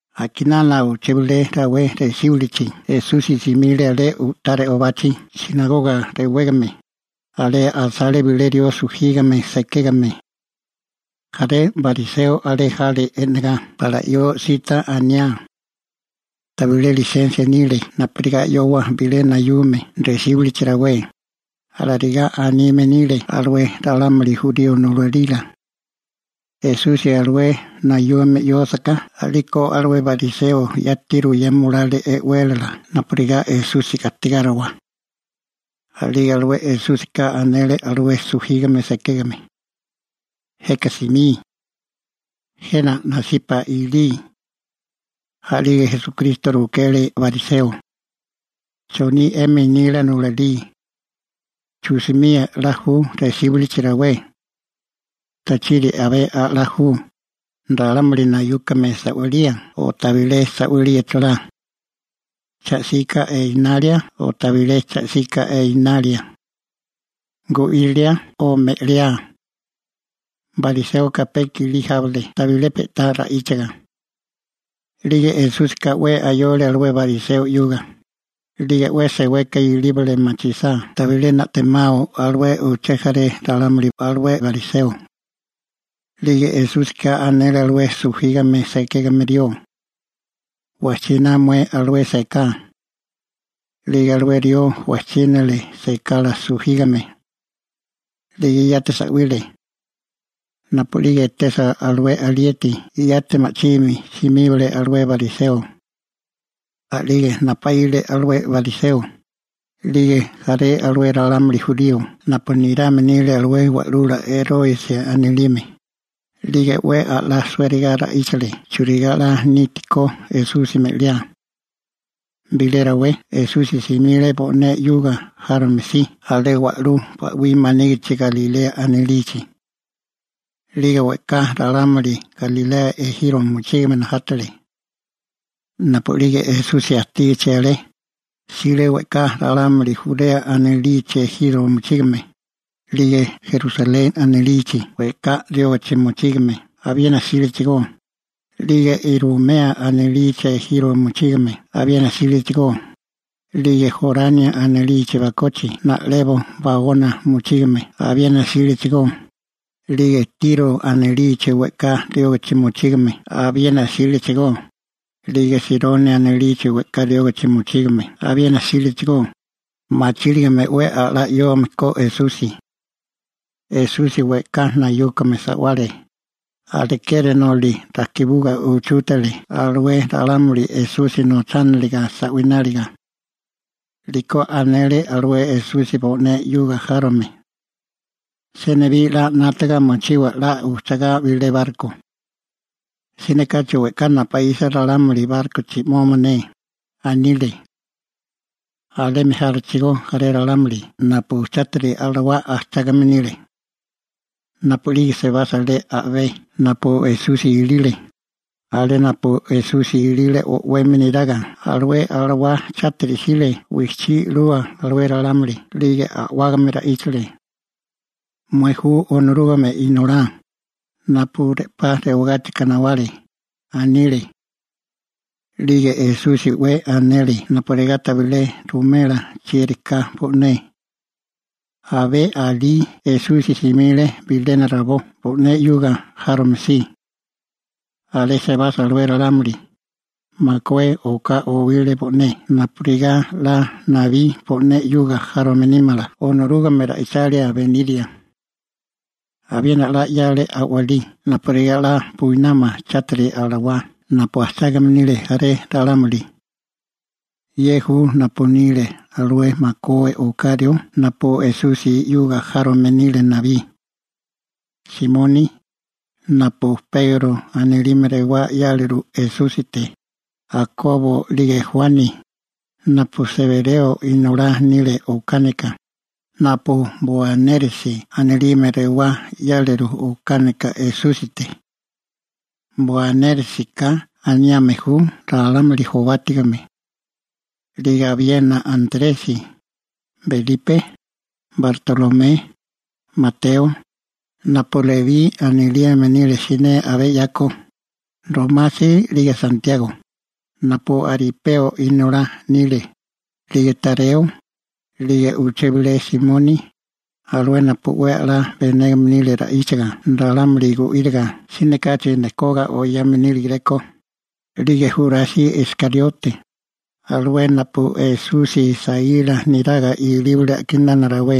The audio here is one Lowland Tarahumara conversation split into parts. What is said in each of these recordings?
A'kinana uché bilé rawé resíbilichi Esusi simile alé u'tá re'obachi «sinagoga» rewégame. Alé asale bilé rió sujígame sekégame. Jaré bariseo alé jale e'negá pala 'yoa sita aniá. Tabilé lisensia nile napurigá 'yowa bilé nayume resíbilichi rawé, alarigá anime nile alué ralámuli jurío nulalila. Esusi alué nayume 'yósaká a'liko alué bariseo yati ruyema olale e'wélala napurigá Esusi gastigáriwa. A'lige alué Esúsika anele alué sujígame sekégame: ―Jeka simí. Jena nasipa ilí. A'lige Esúsika rukele bariseo: ―¿Choní 'emi nila nulalí? ¿Chu'simía 'la ju resíbilichi rawé? ¿Tachiri abé a'lá ju, ralámuli nayúkame sa'walía o tabilé sa'walía chalá? ¿Cha 'sika enalia o tabilé cha 'sika enalia? ¿Gu'írilia o me'liá? Bariséoka pe i'kilí jábale tabilé pe'tá ra'íchiga. 'Lige Esúsika 'we ayole alué bariseo 'yuga, 'lige 'we seweka ilíbale machisá tabilé na'temao alué uché jaré ralámuli alué bariseo. 'Lige Esúsika anele alué sujígame sekégame rió: ―Wajchiná mué alué seká. A'lige alué rió wajchínale sekala sujígame. 'Lige yati sa'wile. Napu'lige etesa alué alieti yati ma'chimi simíbale alué bariseo. A'lige napaíle alué bariseo, 'lige jaré alué ralámuli jurío napu nirame nile alué wa'lula Eróresi anilime, 'lige 'we a'lá suériga ra'íchale churigá 'la nítikó Esusi me'liá. Bilé rawé Esusi simile bo'né 'yuga járome si alé wa'lú ba'wí manígichi Galilea anilichi. 'Lige we'ká ralámuli Galilea ejiro mochígame najátale. Napu'lige Esusi ajtígichi alé, jsile we'ká ralámuli Jurea anilichi ejiro mochígame, 'lige Rusaleni anilichi we'ká riógichi mochígame abiena jsílechigó, 'lige Irumea anilichi ejiro mochígame abiena jsílechigó, 'lige Jorani anilichi bakochi na'lebo baona mochígame abiena jsílechigó, 'lige Tiro anilichi we'ká riógichi mochígame abiena jsílechigó, 'lige Sironi anilichi we'ká riógachi mochígame abiena jsílechigó, machíligame 'we a'lá 'yóome ko Esusi. Esusi we'ká nayúkome sa'wale, alekeri noli rajkibuga uchútale alué ralámuli Esusi nochániliga sa'wináliga. 'Liko anele alué Esusi bo'né 'yuga járome: ―Senibí 'la 'nátaga mochiwa 'la ujchugá bilé barko. Siné kachi we'ká napuísa ralámuli bárkochi 'moma ne ―anile. Alemi jálechigó jaré ralámuli napu chátiri alawá ajchágame nile. Napu'lige sebasa alé a'bé napu Esusi ilile, alé napu Esusi ilile o'wemi neraga, alué chátiri alawá wijchí 'lule alué ralámuli 'lige a'wágame ra'íchale: ―¡Mué ju Onorúgame Inolá, napu re'pá rewagáchika nawale! ―anile. 'Lige Esusi 'we anele napurigá tabilé ruwimela chieri ka bo'né. Abé alí Esusi simile bilena rabó bo'né 'yuga járome si. Alé sebasa alué ralámuli, makué oká owile bo'né napurigá 'la nabí bo'né 'yuga járome nímala Onorúgame ra'ichálila beniria. Abiena 'la 'yale a'walí napurigá 'la buinámala chátiri alawá napu ajchágame nile jaré ralámuli. Ye ju napu nile alué makué oká rió napu Esusi 'yuga járomili nile nabí: Simoni, napu Pegro anilime rewá 'yáleru Esúsite, Jakobo 'lige Juani, napu Sebereo inolá nile okánika, napu Boanérjesi anilime rewá 'yáleru okánika Esúsite. Boanérjesika aniame ju «ralámuli jobátigame». 'Lige abiena Antresi, Belipe, Bartolomé, Mateo napu Lebí anilime nile siné abé 'yako, Romasi 'lige Santiago, napu Aripeo inolá nile, 'lige Tareo, 'lige uché bilé Simoni, alué napu 'we a'lá benégame nile ra'íchaga ralámuli gu'íriga (siné kachi nekoga oyame níligeréko), 'lige Jurasi Iskariote, alué napu Esusi saíla neraga ilíbale a'kinana rawé.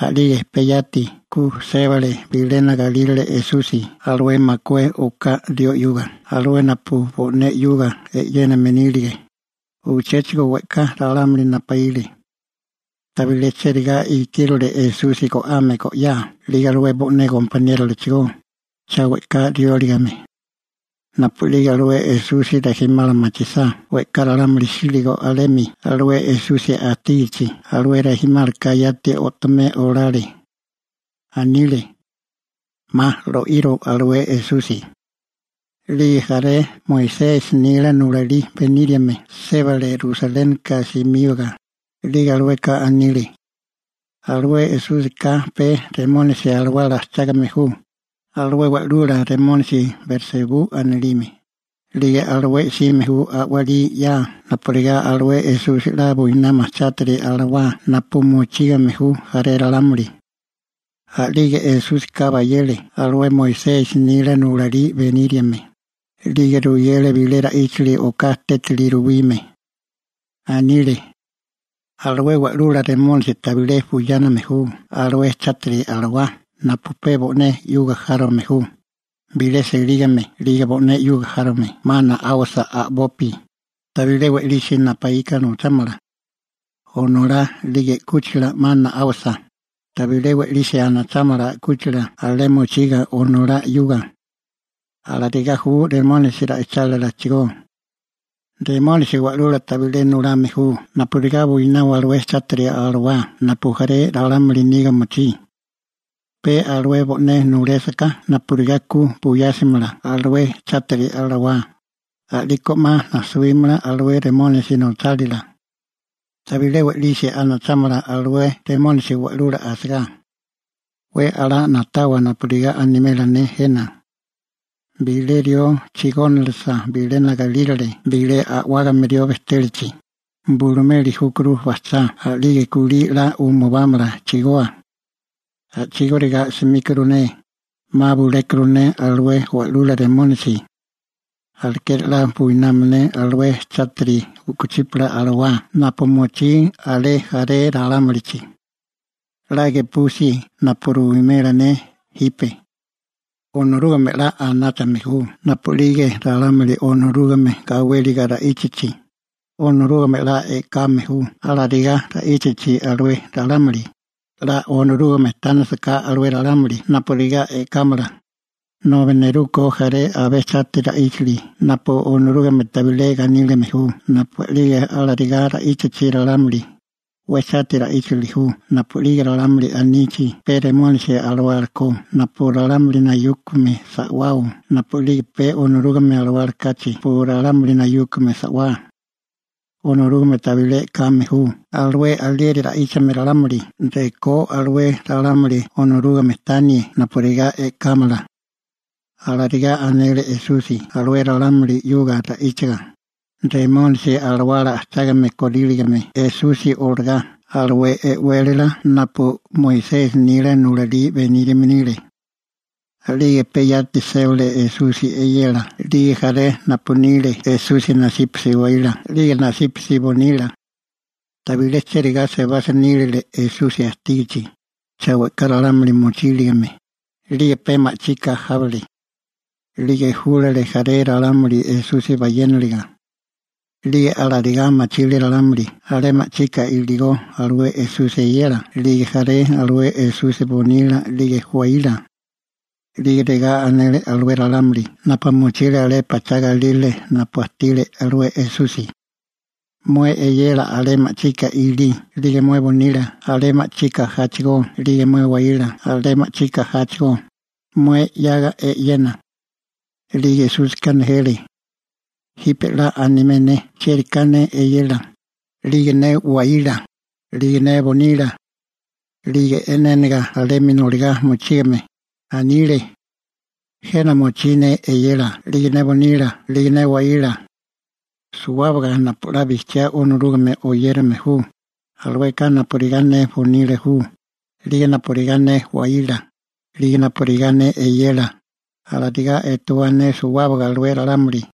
A'lige pe yati ku sébale bilena galírale Esusi alué makué oká rió 'yuga, alué napu bo'né 'yuga e'yéname nílige. Uchéchigo we'ká ralámuli napaíle. Tabilé cherigá ikírole Esusi go'ame go'yá 'lige alué bo'né gompaniérolachigó, cha we'ká rióligame. Napu'lige alué Esusi chega rijimala machisá we'ká ralámuli jsíligo alemi alué Esusi ajtígichi, alué rijimálaka yati o'tomé olale. Anile: ―'Ma lo'iro alué Esusi. 'Lige jaré Moisesi nila nulalí beníriame sébale Rusalénika simíbaga, 'lige alueka anile: ―Alué Esúsika pe Remónisi alawala ajchágame ju, alué wa'lula remónisi Belsebú anilime, 'lige alué 'sime ju a'walí 'ya napurigá alué Esusi 'la buinámala alué chátiri alawá napu mochígame ju jaré ralámuli. A'lige Esúsika bayele alué Moisesi nila nulalí beníriame, 'lige ruyele bilé ra'íchili oká tétili ruwime. Anile: ―Alué wa'lula remónisi tabilé buyáname ju alué chátiri alawá napu pe bo'né 'yuga járome ju. Bilé selígame 'lige bo'né 'yuga járome 'ma na'áwasa a'bopi, tabilé we'lisi napuíka nochámala. Onolá 'lige 'kúchila 'ma na'áwasa, tabilé we'lisi anachámala 'kúchila alé mochiga onolá 'yuga. Alarigá ju Satanasi ra'ichálilachigó. Satanasi wa'lula tabilé nulame ju napurigá buinawa alué chátiri alawá napu jaré ralámuli niga mochí. Pe alué bo'né nulésaká napurigá ku buyásimala alué chátiri alawá, a'liko 'ma najsuímala alué Remónisi nochálila. Tabilé we'lisi anachámala alué Satanasi wa'lula asagá. › 'We a'lá na'tawa napurigá animela ne jena. Bilé rió chigónilisa bilena galírale bilé a'wágame rió bejtélachi, bulumeli júkuru bajchá a'lige kulí 'la umubámala chigoa. A'chigóriga 'smíkuru ne, 'ma bulékuru ne alué wa'lula Satanasi. Alekeri 'la buinámala ne alué chátiri u'kuchípala alawá napu mochí alé jaré ralámulichi. › 'La gepusi napu ruwimela ne jipe. Onorúgame 'la anáchame ju napu'lige ralámuli Onorúgame gawéliga ra'íchachi, Onorúgame 'la e'kame ju alarigá ra'íchachi alué ralámuli, 'la Onorúgame tánasaká alué ralámuli napurigá e'kámala, nobi neruko jaré abé chátiri ra'íchili napu Onorúgame tabilé ganílime ju napu'lige alarigá ra'íchachi ralámuli, 'we chátiri ra'íchili ju napu'lige ralámuli anichi pe Remónisi alawala ko napu ralámuli nayúkome sa'wao napu'lige pe Onorúgame Alawala kachi napu ralámuli nayúkome sa'wá. Onorúgame tabilé e'kame ju alué alieri ra'íchame ralámuli rekó alué ralámuli Onorúgame tanie napurigá e'kámala. Alarigá anele Esusi alué ralámuli 'yuga ra'íchaga, Remónisi alawala ajchágame koríligame Esusi olagá alué e'wélala napu Moisesi nila nulalí beníriame nile. A'lige pe yati sébale Esusi eyela 'lige jaré napu nile Esusi nasípasi waíla 'lige nasípasi bonila. Tabilé chérigá sebasa nílile Esusi ajtígichi, cha we'ká ralámuli mochíligame, a'lige pe ma'chika jábale. 'Lige júlale jaré ralámuli Esusi bayéniliga. 'Lige alarigá machile ralámuli alé ma'chika iligó alué Esusi eyela 'lige jaré alué Esusi bonila 'lige waíla. 'Lige regá anele alué ralámuli napu mochile alé a'bé pachá galírale napu ajtile alué Esusi: ―Mué eyela alé ma'chika ilí 'lige mué bonila alé ma'chika jáchigó 'lige mué waíla alé ma'chika ja chigó, mué 'yaga e'yena. 'Lige Esúsika nejele: ―Jipe 'la animé ne chieri ka ne eyela, 'lige ne waíla, 'lige ne bonila. 'Lige e'nénaga alemi noligá mochígame, anile: ―Jena mochí ne eyela 'lige ne bonila 'lige ne waíla. Suwábaga napu 'la bijchiá Onorúgame oyérame ju, alueka napurigá ne bonila ju, 'lige napurigá ne waíla, 'lige napurigá ne eyela, alarigá etewá ne suwábaga alué ralámuli.